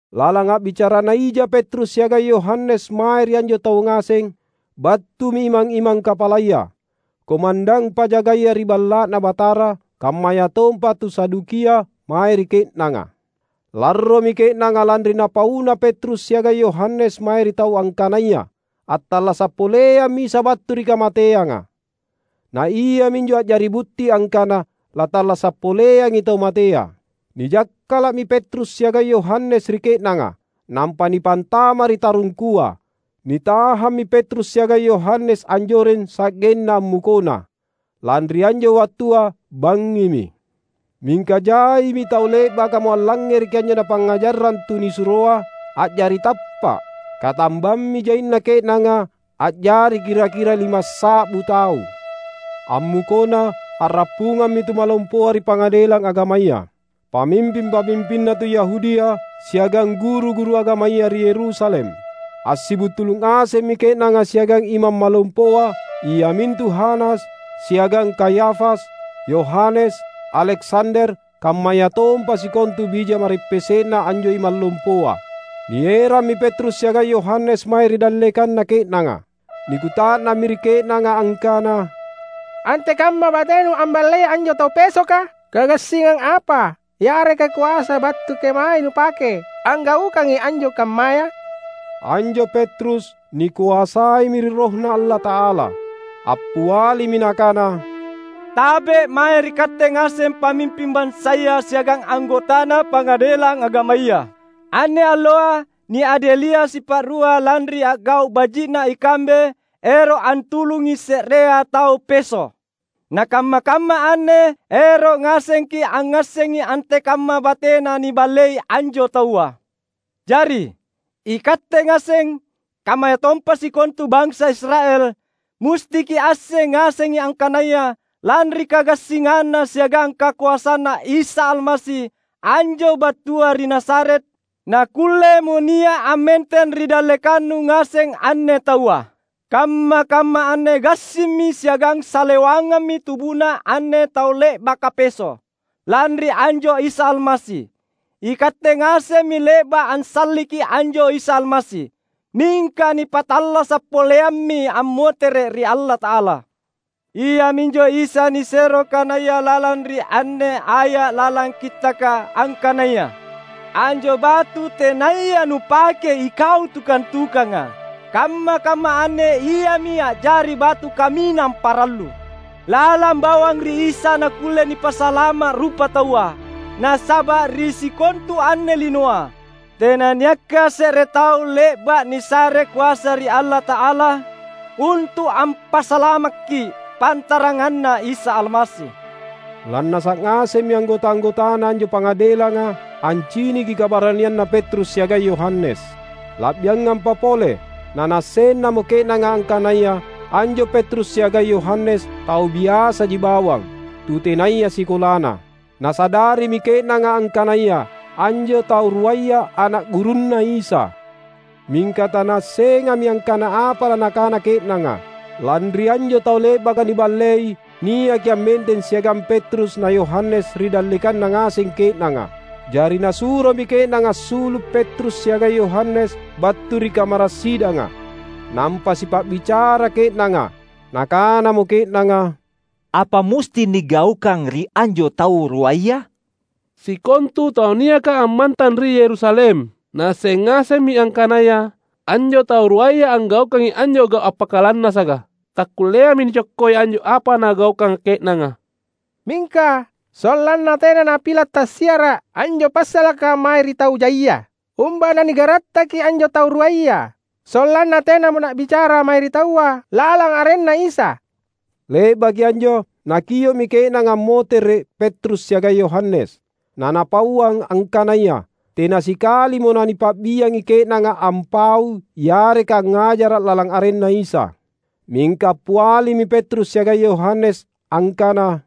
Lalang a’bicarana ija Petrus siagang Yohanes mae ri anjo taua ngaseng, battumi imang-imang kapalaya, komandang pajagaya ri Balla’Na Batara, kammayatompa tu Sadukia mae ri ke’nanga. Larromi ke’nanga lanri napauna Petrus siagang Yohanes mae ri taua angkanaya attallasa’ poleammi Isa battu ri kamateanga. Na iaminjo a’jari butti angkana lattallasa’ poleangi tau matea. Nijakkala’mi Petrus siagang Yohanes ri ke’nanga, nampa nipantama’ ri tarungkua. Nitahammi Petrus siagang Yohanes anjoreng sa’genna ammukona, lanri anjo wattua bangngimi. Mingka jaimi tau le’bakamo allangngereki anjo napangngajarrang tunisuroa, a’jari tappa’. Katambammi jaina ke’nanga a’jari kira-kira limassa’bu tau. Ammukona a’rappungammi tumalompoa ri Pangadelang Agamaya, pamimping-pamimpinna tu Yahudia, siagang guru-guru agamaya ri Yerusalem. Assibuntulu’ ngasemmi ke’nanga siagang Imang Malompoa iamintu Hanas, siagang Kayafas, Yohanes, Aleksander, kammayatompa sikontu bija ma’reppese’na anjo imang lompoa. Nierammi Petrus siagang Yohanes mae ri dallekanna ke’nanga. Nikuta’nammi ri ke’nanga angkana, "Antekamma batenu amballei anjo tau pesoka? Kagassingang apa yareka koasa battu kemae nupake anggaukangi anjo kammaya?" Anjo Petrus nikoasaimi ri RohNa Allata’ala. Appialimi nakana, "Tabe’, mae ri katte ngaseng pamimping bansaya siagang anggotana pangadelang agamaya! Anne alloa niadelia’ sipa’rua lanri a’gau’ baji’na ikambe ero’ antulungi se’rea tau peso’. Na kamma-kamma anne ero’ ngasengki’ angngassengi antekamma batena niballei anjo taua. Jari, ikatte ngaseng, kammayatompa sikontu bansa Israel, musti kiasseng ngasengi angkanaya lanri kagassinganNa siagang kakoasanNa Isa Almasi anjo battua ri Nazaret, nakkullemo nia’ ammenteng ri dallekannu ngaseng anne taua. Kamma-kamma anne gassimmi siagang salewangammi tubuna anne tau le’baka peso’, lanri anjo Isa Almasi. Ikatte ngasemmi le’ba’ ansalliki anjo Isa Almasi. Mingka nipattallasa’ poleammi ammotere’ ri Allata’ala. Iaminjo Isa nisero kanaya lalang ri anne aya’ lalang Kittaka, angkanaya, ‘Anjo batu tenaya nupakei ikau tukang-tukanga, kamma-kamma anne iami a’jari batu kaminang parallu.’ Lalang bawang ri Isa nakkulle nipasalama’ rupataua. Nasaba’ ri sikontu anne linoa, tenanniakka se’re tau le’ba’ nisare koasa ri Allata’ala untu’ ampasalamakki’, pantaranganna Isa Almasi." Lannasa’ ngasemmi anggota-anggotana anjo Pangadelanga anciniki kabaranianna Petrus siagang Yohanes. La’biangampa pole nanaassennamo ke’nanga angkanaya anjo Petrus siagang Yohanes tau biasaji bawang, tutenaya sikolana. Nasadarimi ke’nanga angkanaya anjo tau ruaya ana’ gurunNa Isa. Mingka tanaassengami angkana apa lanakana ke’nanga, lanri anjo tau le’baka niballei niaki ammenteng siagang Petrus na Yohanes ri dallekanna ngaseng ke’nanga. Jari nasuromi ke’nanga assulu’ Petrus siagang Yohanes battu ri kamara’ sidanga, nampa sipa’bicara ke’nanga. Nakanamo ke’nanga, "Apa musti nigaukang ri anjo tau ruaya? Sikontu tau niaka ammantang ri Yerusalem naasseng ngasemmi angkanaya anjo tau ruaya anggaukangi anjo gau’ appakalannasaka. Takkulleami nicokkoi anjo apa nagaukanga ke’nanga. Mingka sollanna tena napila’ tassiara’ anjo passalaka mae ri tau jaia, umba nanigarattaki anjo tau ruaya, sollanna tenamo na’bicara mae ri taua lalang arenNa Isa." Le’baki anjo, nakio’mi ke’nanga ammotere’ Petrus siagang Yohanes, nanapauang angkanaya tena sikalimo nanipa’biangi ke’nanga ampaui yareka angngajara’ lalang arenNa Isa. Mingka appialimi Petrus siagang Yohanes angkana,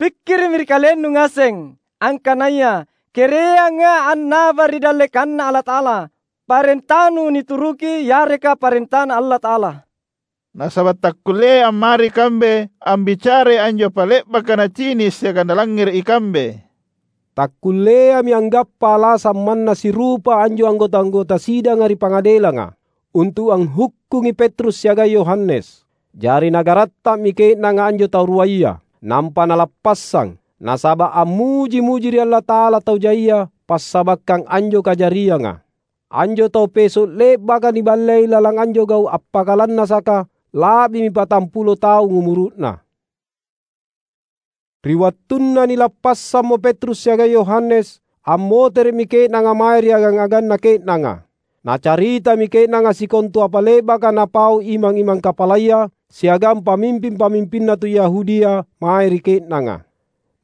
"Pikkiri’mi ri kalennu ngaseng, angkanaya kereanga annaba ri dallekanNa Allata’ala: parentanu nituruki, yareka parentaNa Allata’ala. Nasaba’ takkulleai ammari ikambe ambicarai anjo apa le’baka nacini’ siagang nalangngere’ ikambe." Takkulleami anggappa alasang manna sirupa anjo anggota-anggota sidanga ri pangadelanga, untu’ anghukkungi Petrus siagang Yohanes. Jari nagaratta’mi ke’nanga anjo tau ruaya, nampa nalappassang, nasaba’ ammuji-muji ri Allata’ala tau jaia passabakkang anjo kajarianga. Anjo tau peso’ le’baka niballei lalang anjo gau’ appakalannasaka, la’bimi patampulo taung umuru’na. Ri wattunna nilappassammo Petrus siagang Yohanes, ammotere’mi ke’nanga mae ri agang-aganna ke’nanga. Nacaritami ke’nanga sikontu apa le’baka napau imang-imang kapalaya siagang pamimping-pamimpinna tu Yahudia mae ri ke’nanga.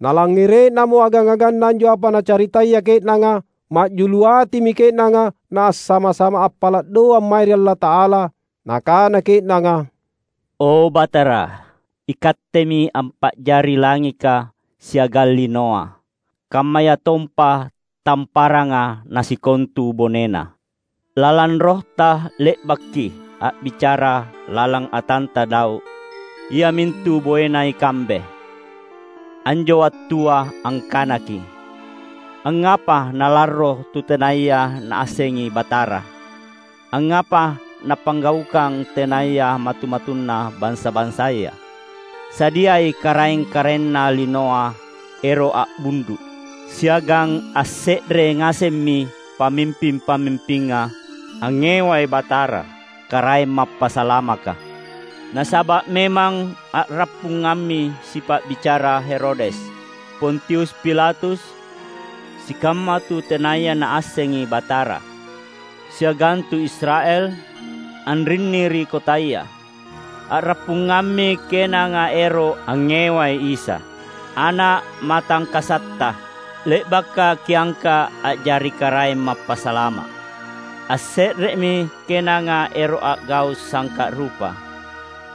Nalangngere’namo agang-aganna anjo apa nacaritaya ke’nanga, ma’julu atimi ke’nanga naassama-sama appala’ doang mae ri Allata’ala. Nakana ke’nanga, "O Batara, iKattemi ampa’jari langika siagang linoa, kammayatompa tamparanga na sikontu bonena. Lalang RohTa le’bakKi’ a’bicara lalang atanTa Daud iamintu boena ikambe; anjo wattua angkanaKi’, ‘Angngapa nalarro tu tenaya naassengi Batara; angngapa nappanggaukang tenaya matu-matunna bansa-bansaya? Sadiai karaeng-karaenna linoa ero’ a’bundu’, siagang asse’re ngasemmi pamimping-pamimpinga angngewai Batara, Karaeng Mappasalamaka.’ Nasaba’ memang, a’rappungammi sipa’bicara Herodes, Pontius Pilatus, sikamma tu tenaya naassengi Batara, siagang tu Israel anrinni ri kotaya. A’rappungammi ke’nanga ero’ angngewai Isa, Ana’ matangkasatTa, le’baka Kiangka’ a’jari Karaeng Mappasalama’. Asse’remi ke’nanga ero’ a’gau’ sangka’ rupa,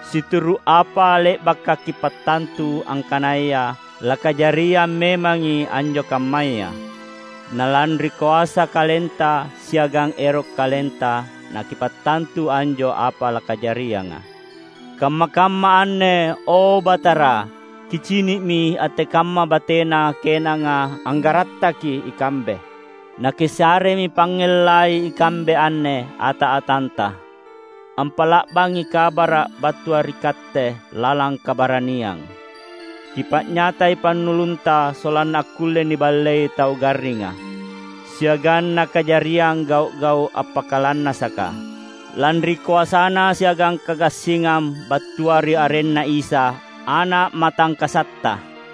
situru’ apa le’baka Kipattantu angkanaya lakajariang memangi anjo kammaya. Na lanri koasa KalenTa siagang ero’ KalenTa naKipattantu anjo apa lakajarianga. Kamma-kamma anne, o, Batara, Kicini’mi antekamma batena ke’nanga anggarattaki ikambe. Na Kisaremi pangngellai ikambe anne, ata-atanTa, ampa’la’bangi kabara’ battua ri Katte lalang kabaraniang. Kipa’nyatai pannulunTa sollanna akkulle niballei tau garringa, siagang nakajariang gau’-gau’ appakalannasaka, lanri koasana siagang kagassingang battua ri arenNa Isa, Ana’ MatangkasatTa."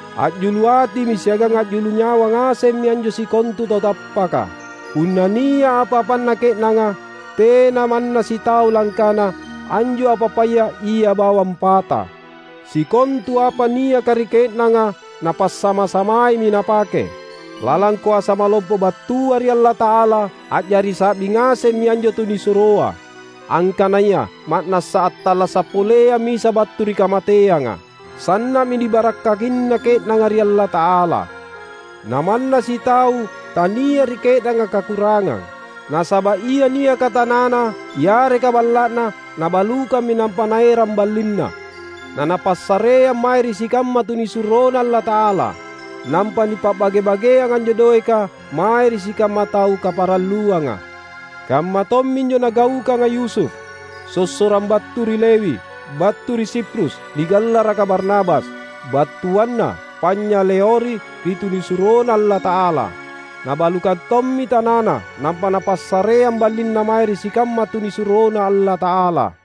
A’julu atimi siagang a’julu nyawa ngasemmi anjo sikontu tau tappaka. Punna nia’ apa-apanna ke’nanga, tena manna sitau langkana anjo apa-apaya ia bawang pata. Sikontu apa niaka ri ke’nanga, napassama-samaimi napake. Lalang koasa malompo battua ri Allata’ala, a’jari sa’bi ngasemmi anjo tunisuroa, angkanaya ma’nassa attallasa’ poleammi Isa battu ri kamateanga. Sanna’mi nibarakkakina ke’nanga ri Allata’ala. Na manna sitau tania’ ri ke’nanga kakurangang. Nasaba’ ia niaka tanana yareka balla’na, nabalukammi nampa naerang ballinna, nanapassareang mae ri sikamma tunisuroNa Allata’ala. Nampa nipa’bage-bageang anjo doeka mae ri sikamma tau kaparalluanga. Kamma tomminjo nagaukanga Yusuf, sossorang battu ri Lewi, battu ri Siprus, nigallaraka Barnabas (battuanna Panynyaleori) ri tunisuroNa Allata’ala. Nabalukang tommi tanana, nampa napassareang ballinna mae ri sikamma tunisuroNa Allata’ala.